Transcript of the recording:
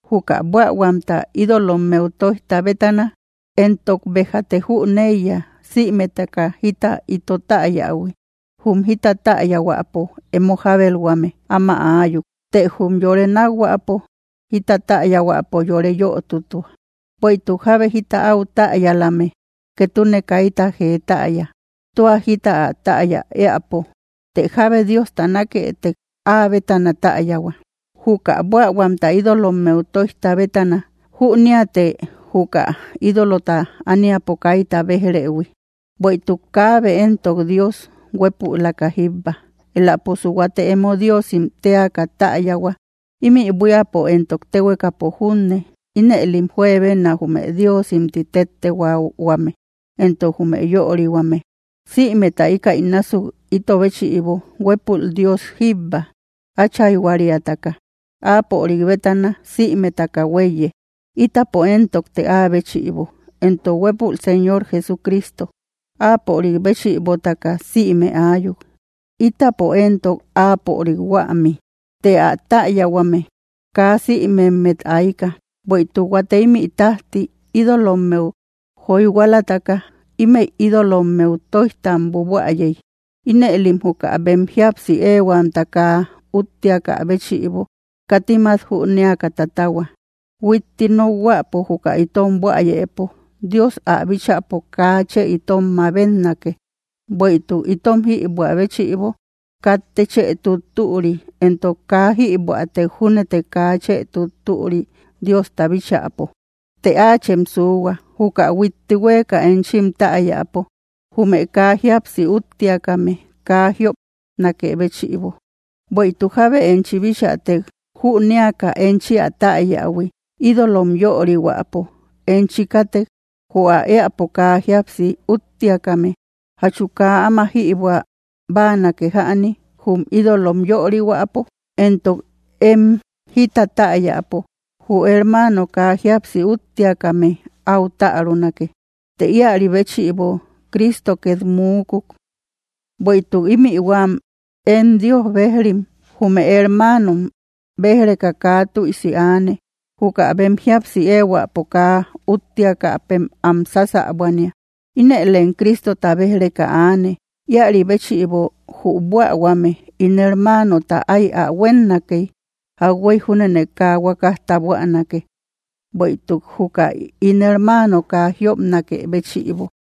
Juka buähuamta ídolommeu toijta bétana, entok bejate jüneiya sïmetaka jita ito täyähui, jum jita täyahuäpo emo jabelhuame áma ayuk, të jum yore nakhuäpo jita täyahuäpo yore yötutua. Bueïtuk jábe jita áu täyalame, ketune kayta jee täya, tua jita ä täya éäpo. Të jábe Diosta naketek, ä bétana täyahua. Juka buähuamta ídolommeu toijta bétana, jüniate juka ídolota ániapo kayta bejrehui, bueïtuk kabe entok Dios, huépülaka jíbba. Elaposu huate emo diosim teaka täyahua, imï buíapo entok téhuekapo junne (inëlim juebenna jume diosim ti tettehuahuame, entok jume yörihuame), sïmeta íkäi násuk itobéchïbo huépül Dios jíbba, achayhuariataka, áapörik bétana simetaka huéiye, itapo entokte ä béchïbo, entok huepúl Señor Jesucristo, áapörik béchïbotaka sïme ayuk, itapo entok áapörik huämi. Të ä täyahuame kaa sïmemmet ayka; bueïtuk huate imï tajti, ídolommeu joyhualataka, ímëi ídolommeu toijtam buabuäyey, inëlim juka bem jíapsi ehuamta kaa úttiaka béchïbo, katim at jünéaka tatahua. Huitti nokhuäpo juka itom buäyepo Dios ä bíchäpo kaa chë itom mabetnake; bueïtuk itom jïbuä béchïbo katte chë tuttüri, entok kaa jïbuätek júnete kaa chë tuttüri Diosta bíchäpo. Të áachem suhua juka huitti hueka enchim täyapo, jume kaa jíapsi úttiakame kaa jiopnakë béchïbo. Bueïtuk jábe enchi bichätek, jünéaka enchi ä täyähui, ídolom yörihuäpo enchi katek, jü ä eäpo kaa jíapsi úttiakame, ¿jachu kaa áma jïbuä báanake jäni, jum ídolom yörihuäpo? Entok em jita täyapo; jü hermano kaa jíapsi úttiakame au tärunake, të ïari béchïbo Cristo ket múukuk. Bueïtuk imï huäm em Dios bejrim, jume hermanom bej‑reka kaa tüisi aane, juka bem jíapsi ehuäpo kaa úttiakapem am sasabuania, inëlem Cristota bej‑reka aane. Ïari béchïbo, jü buähuame ín hermanota ái ä huennakey, jauhuey júnene kaa huakasta buänake. Bueïtuk juka ín hermano kaa jiopnake béchïbo.